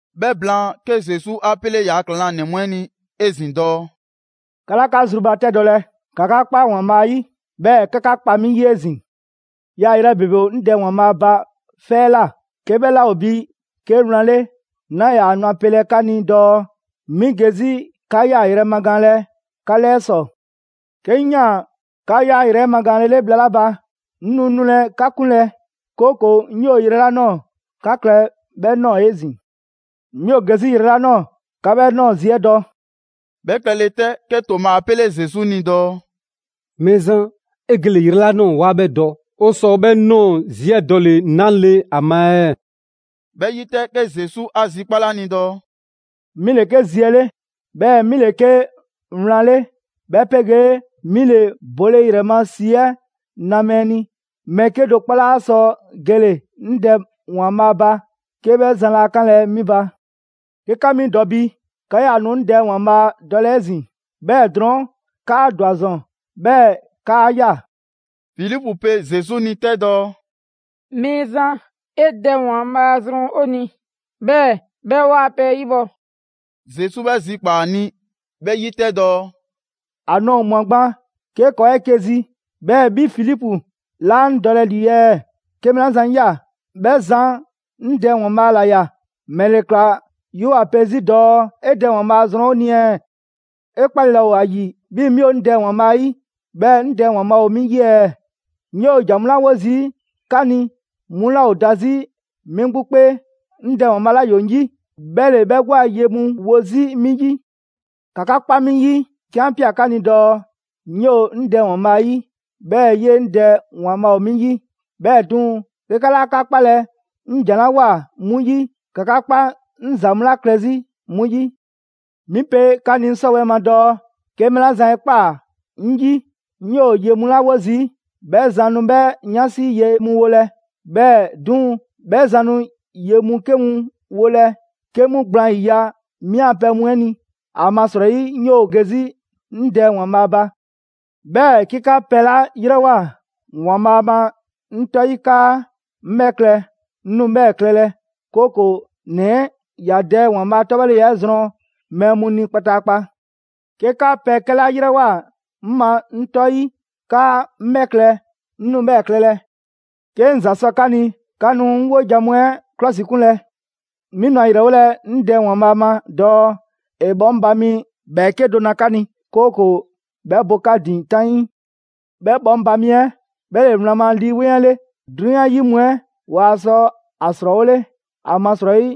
'Bhɛ blaan, 'ke Zesu 'a 'pele ‑yaa' ‑klaŋlanɛ mu 'ɛ ni 'ezin‑ dɔɔ: «'Ka 'laa 'ka zrubatɛdɔlɛ. ‑Ka 'ka 'kpa ‑Waanbhaa' 'yi, 'bhɛɛ‑ ‑ka 'ka 'kpa 'mi 'yi 'ezin‑. Yaayrɛ ‑bebe ‑o 'ŋ Dɛ ‑Waanbhaa' ba 'fɛ 'ɛ ꞊la. 'Ke 'bhɛ 'laa ‑o bi 'ke wlan 'le, 'naa ‑yaa nu ‑a pelɛ 'ka ni dɔɔ 'mi ge 'zi 'ka 'yaayrɛ‑ magaanlɛ 'ka 'lɛɛ ‑sɔ. 'Ke 'ŋ 'yaan‑ 'ka 'yaayrɛ‑ 'ɛ magaanlele bhla 'la ba, 'ŋ nu nulɛ 'ka 'kunlɛ‑, 'kooko‑ 'ŋ 'yoo‑ yrɛ 'la ꞊nɔɔ 'ka klɛ 'bhɛ ꞊nɔɔ 'ezin‑. 'Mi ‑o ge 'zi yrɛ 'la ꞊nɔɔ, 'ka 'bhɛ ꞊nɔɔ zi 'ɛ dɔ.» 'Bhɛ klɛle 'tɛ, 'ke Toma 'a 'pele Zesu ni dɔɔ: «Mɛɛzan, 'e gele‑ yrɛ 'la ꞊nɔɔ 'waa 'bhɛ dɔ. 'O sɔ 'bhɛ ꞊nɔɔ zi 'ɛ dɔle‑ 'nale‑ ‑a ma ɛɛ?» 'Bhɛ 'yi 'tɛ, 'ke Zesu 'a zikpale ‑a ni dɔɔ: «'Mi ‑le 'ke Zi 'ɛ 'le, 'bhɛɛ‑ 'mi ‑le 'ke wlan 'le, 'bhɛ 'pegee 'mi ‑le bole ‑yrɛ ma ‑si 'ɛ 'na mɛɛ ni. Mɛɛ 'kedo‑ 'kpɔ 'laa sɔ gele‑ 'ŋ Dɛ ‑Waanbhaa ba 'ke 'bhɛ zan laa 'kanlɛ‑ 'mi ba. 'Ke 'ka 'mi dɔ bi, 'ka 'yaa‑ nu 'ŋ Dɛ ‑Waanbhaa' dɔlɛ 'ezin‑. 'Bhɛɛ‑ drɔɔn' 'kaa ‑dwa ‑zɔn, 'bhɛɛ‑ 'kaa ꞊ya.» Filipu pe Zesu ni 'tɛ dɔɔ: «Mɛɛzan, 'e Dɛ ‑Waanbhaa' zrɔn 'o ni, 'bhɛɛ‑ 'bhɛ 'waa‑ pɛ 'ɛ 'yibhɔ‑.» Zesu 'bhɛ zikpaa‑ ‑a ni 'bhɛ 'yi 'tɛ dɔɔ: «‑A nɔɔ‑ ꞊mwa gban 'ke ‑kɔɔ' ‑o 'eke‑ zi, 'bhɛɛ‑ 'bhi Filipu 'laa 'ŋ dɔlɛ ‑lii ɛɛ? 'Ke mɛɛ 'la zan 'ŋ ꞊ya 'bhɛ zan 'ŋ Dɛ ‑Waanbhaa' ‑la ꞊ya. ‑Mɛle ‑kla 'yoo‑ ‑a 'pe 'zi dɔɔ: ‹'E Dɛ ‑Waanbhaa zrɔn 'o ni ɛɛ?› 'E 'kpale‑ laa ‑o ‑a ‑yi 'bhii‑ 'mi ‑o 'ŋ Dɛ ‑Waanbhaa' 'yi, 'bhɛɛ‑ 'ŋ Dɛ ‑Waanbhaa' ‑o 'mi 'yi ɛɛ? 'Ŋ 'yoo‑ ‑jan mu 'la 'wo zii' 'ka ni, 'mu 'laa ‑o da 'zi 'mi 'gbu 'kpee. 'Ŋ Dɛ ‑Waanbhaa' 'la ‑yoo 'ŋ 'yi, 'bhɛ ‑le 'bhɛ 'gbu a ye mu wo 'zi 'mi 'yi. ‑Ka 'ka 'kpa 'mi 'yi 'ke 'an 'pia‑ 'ka ni dɔɔ: 'ŋ 'yoo‑ 'ŋ Dɛ ‑Waanbhaa' 'yi, 'bhɛɛ‑ 'yee‑ 'ŋ Dɛ ‑Waanbhaa' ‑o 'mi 'yi. 'Bhɛɛ‑ 'duŋ‑, 'ke 'ka 'laa 'ka 'kpalɛ‑ 'ŋ ‑jan 'la ꞊woa 'mu 'yi, ‑ka 'ka 'kpa 'ŋ ‑za mu 'la klɛ 'zi 'mu 'yi. 'Mi pe 'ka ni 'ŋ 'sɔwɛɛ‑ ma dɔɔ: 'ke mɛɛ 'la zan 'e ꞊kpaa 'ŋ 'yi, 'ŋ 'yoo‑ ye mu 'la 'wo zii', 'bhɛ zan nu 'bhɛ 'yansi ye mu 'wolɛ‑. 'Bhɛɛ‑ 'duŋ‑, 'bhɛ zan nu ye mu 'ke mu wolɛ 'ke 'mu gblaan ‑yiya' 'mi a pɛ mu 'ɛ ni, ‑amasrɔyi 'ŋ 'yoo‑ ge 'zi 'ŋ Dɛ ‑Waanbhaa' ba. 'Bhɛɛ‑ 'ke 'ka pɛ 'la 'yrɛwoa‑ ‑Waanbhaa' ma 'ŋ 'tɔ 'yi 'kaa 'ŋ 'bhɛ klɛ, 'ŋ nu 'bhɛɛ‑ klɛlɛ, 'kooko‑ ‑Nɛ 'ɛ ‑ya Dɛ ‑Waanbhaa' 'tɔbhɔleya 'ɛ zrɔn mɛɛ mu ni kpataakpa. 'Ke 'ka pɛ 'kɛ 'la ‑yrɛwoa 'ŋ ma 'ŋ 'tɔ 'yi 'kaa 'ŋ 'bhɛ klɛ, 'ŋ nu 'bhɛɛ‑ klɛlɛ.» «'Ke 'ŋ ‑za sɔ 'ka ni, 'ka nu 'ŋ 'wojan‑ mu 'ɛ 'klɔsikunlɛ. 'Mi nu ‑a ‑yrɛwolɛ 'ŋ Dɛ ‑Waanbhaa' ma dɔɔ ‑e bhɔŋba mi ‑bhɛɛke' do na 'ka ni, 'kooko‑ 'bhɛ bo 'ka ‑din 'taŋii. 'Bhɛ 'bhɔŋba‑ mi 'ɛ 'bhɛ ‑le wlan ma Lii 'Weŋ 'ɛ 'le. 'Drunyan 'yi mu 'ɛ waa sɔ ‑a ‑srɔɔwole, ‑amasrɔyi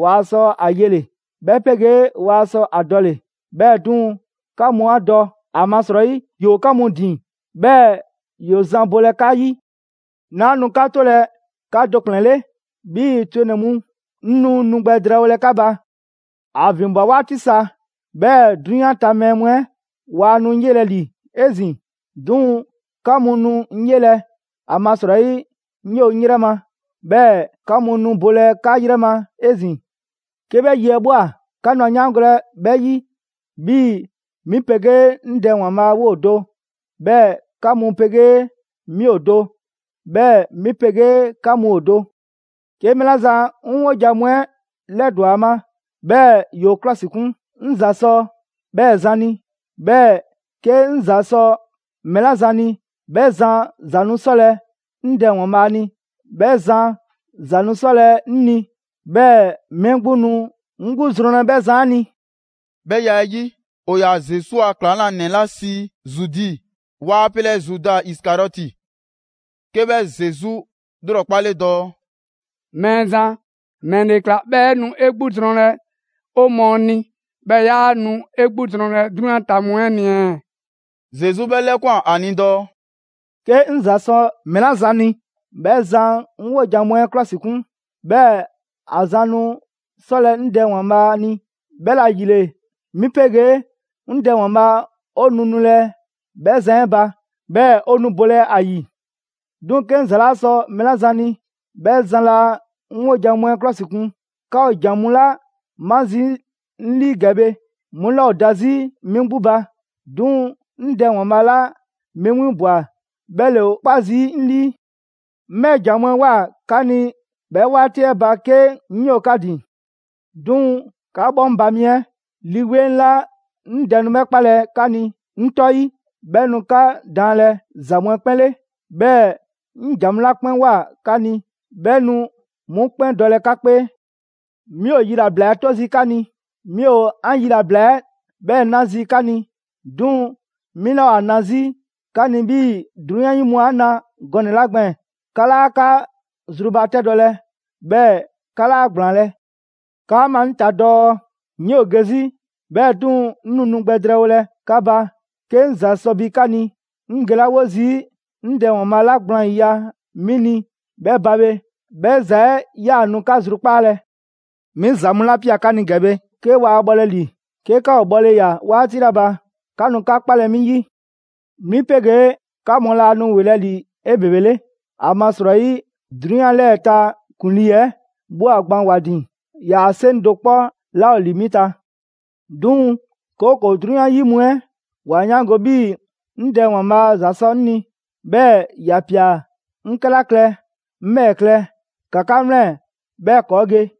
waa sɔ ‑a yele‑, 'bhɛ 'pegee waa sɔ a dɔle‑. 'Bhɛɛ‑ 'duŋ‑, 'ka mu 'a dɔ, ‑amasrɔyi ‑yoo 'ka mu ‑din, 'bhɛɛ‑ ‑yoo zan bolɛ 'ka 'yi. 'Naa nu 'ka 'tolɛ‑ 'ka do ‑kplɛn 'le 'bhii‑ twenɛ‑ mu; 'ŋ nu nu gbɛ drɛɛwolɛ 'ka ba. ‑A ‑vinbwa 'waati sa, 'bhɛɛ‑ 'drunyan ta mɛɛ mu 'ɛ waa nu 'ŋ 'yelɛ‑ ‑li 'ezin‑. 'Duŋ‑ 'ka mu nu 'ŋ 'yelɛ‑, ‑amasrɔyi 'ŋ 'yoo‑ 'ŋ 'yrɛ ma, 'bhɛɛ‑ 'ka mu nu bolɛ 'ka 'yrɛ ma 'ezin‑. 'Ke 'bhɛ yi 'ɛ ꞊bhwa, 'ka nu ‑a 'yaangolɛ 'bhɛ 'yi, 'bhii‑ 'mi 'pegee 'ŋ Dɛ ‑Waanbhaa' 'woo do, 'bhɛɛ‑ 'ka mu 'pegee 'mi ‑o do, 'bhɛɛ‑ 'mi 'pegee 'ka mu ‑o do.» «'Ke mɛɛ 'la zan 'ŋ 'wojan‑ mu 'ɛ 'lɛdɔ‑ ‑a ma, 'bhɛɛ‑ ‑yoo 'klɔsikun, 'ŋ ‑za sɔ 'bhɛɛ‑ zan ni. 'Bhɛɛ‑ 'ke 'ŋ ‑za sɔ mɛɛ 'la zan ni, 'bhɛ zan ‑za nu 'sɔlɛ‑ 'ŋ Dɛ ‑Waanbhaa' ni. 'Bhɛ zan ‑za nu 'sɔlɛ‑ 'ŋ ni, 'bhɛɛ‑ 'mi 'gbu nu 'ŋ 'gbu zrɔnlɛ 'bhɛ zan 'ɛ ni.» 'Bhɛ ya 'ɛ 'yi, ‑o ‑yaa Zesu a ‑klaŋlanɛ 'la sii Zudi, waa pelɛ Zuda Isikariɔti, 'ke 'bhɛ Zesu 'lrɔkpale dɔɔ: «Mɛɛzan, ‑mɛle ‑kla 'bhɛɛ‑ 'e nu 'e 'gbu zrɔnlɛ 'o mɔɔ ni, 'bhɛɛ‑ 'yaa nu ‑e 'gbu zrɔnlɛ 'drunyan ta mu 'ɛ ni ɛɛ?» Zesu 'bhɛ 'lɛkwan‑ ‑a ni dɔɔ: «'Ke 'ŋ ‑za sɔ mɛɛ 'la zan ni, 'bhɛ zan 'ŋ 'wojan‑ mu 'ɛ 'klɔsikun. 'Bhɛɛ‑ ‑a ‑za nu 'sɔlɛ‑ 'ŋ Dɛ ‑Waanbhaa' ni. 'Bhɛla‑ ‑yile 'mi 'pegee 'ŋ Dɛ ‑Waanbhaa' 'o nu nulɛ 'bhɛ zan 'ɛ ba, 'bhɛɛ‑ ‑o nu bolɛ ‑a ‑yi. 'Duŋ‑ 'ke 'ŋ ‑za 'laa sɔ mɛɛ 'la zan ni, 'bhɛ zan laa 'ŋ 'wojan‑ mu 'ɛ 'klɔsikun. 'Ka ‑o ‑jan mu 'la 'ma zii' 'ŋ 'lii ‑gɛ bhe, 'mu 'laa ‑o da 'zi 'mi 'gbu ba; 'duŋ‑ 'ŋ Dɛ ‑Waanbhaa' 'la 'mi 'winbwa‑ 'bhɛ ‑le ‑o 'kpa zii' 'ŋ 'lii. 'Ŋ 'bhɛ ‑jan mu 'ɛ ꞊woa 'ka ni 'bhɛ 'waati 'ɛ ba 'ke 'ŋ 'yoo‑ 'ka ‑din. 'Duŋ‑ 'ka 'bhɔŋba‑ mi 'ɛ, Lii 'Weŋ 'la 'ŋ Dɛ nu 'bhɛ 'kpalɛ‑ 'ka ni 'ŋ 'tɔ 'yi, 'bhɛ nu 'ka daanlɛ ‑za mu 'ɛ 'kpɛn 'le, 'bhɛɛ‑ 'ŋ ‑jan mu 'la 'kpɛn ꞊woa 'ka ni, 'bhɛ nu 'mu 'kpɛn dɔlɛ 'ka 'kpee.» «'Mi ‑o yilabla 'ɛ 'to zii' 'ka ni, 'mi ‑o 'an yilabla 'ɛ 'bhɛɛ‑ 'na zii' 'ka ni. 'Duŋ‑ 'mi 'laa ‑o ‑a na 'zi 'ka ni 'bhii‑ 'drunyan 'yi mu 'a na gɔnɛ‑ 'la gbɛɛn‑. 'Ka 'laa 'ka zrubatɛdɔlɛ, 'bhɛɛ‑ 'ka 'laa ‑gblaanlɛ'. 'Kaa ꞊maa 'ŋ ta dɔɔ: ‹'Ŋ 'yoo‑ ge 'zi, 'bhɛɛ‑ 'duŋ‑ 'ŋ nu nu gbɛ drɛɛwolɛ 'ka ba.› 'Ke 'ŋ ‑za sɔ bi 'ka ni, 'ŋ gelawo zii' 'ŋ Dɛ ‑Waanbhaa' 'la gblaan ‑yiya' 'mi ni 'bhɛ ba bhe, 'bhɛ ‑za 'ɛ 'yaa‑ nu 'ka zrukpaalɛ. 'Mi ‑za mu 'la ꞊pia 'ka ni ‑gɛ bhe, 'ke waa bhɔlɛ ‑li; 'ke 'ka ‑o bhɔle ꞊ya 'waati 'la ba, 'ka nu 'ka 'kpalɛ‑ 'mi 'yi. 'Mi 'pegee 'ka mu laa nu ‑welɛ' ‑li 'ebebele. ‑Amasrɔyi 'drunyan 'lɛɛ‑ ‑a ta ‑kuŋlii 'ɛ ꞊bhwa gban ‑wa ‑din. ‑Yaa' 'seŋ do 'kpɔ 'laa ‑o ‑li 'mi ta. 'Duŋ‑, 'kooko‑ 'drunyan 'yi mu 'ɛ ‑wa 'yaango‑ 'bhii‑ 'ŋ Dɛ ‑Waanbhaa' ‑za sɔ 'ŋ ni, 'bhɛɛ‑ ‑ya ꞊pia 'ŋ 'kɛla klɛ, 'ŋ 'bhɛɛ‑ klɛ. ‑Ka 'ka 'wlɛn‑ 'bhɛɛ‑ ‑kɔɔ' ge!»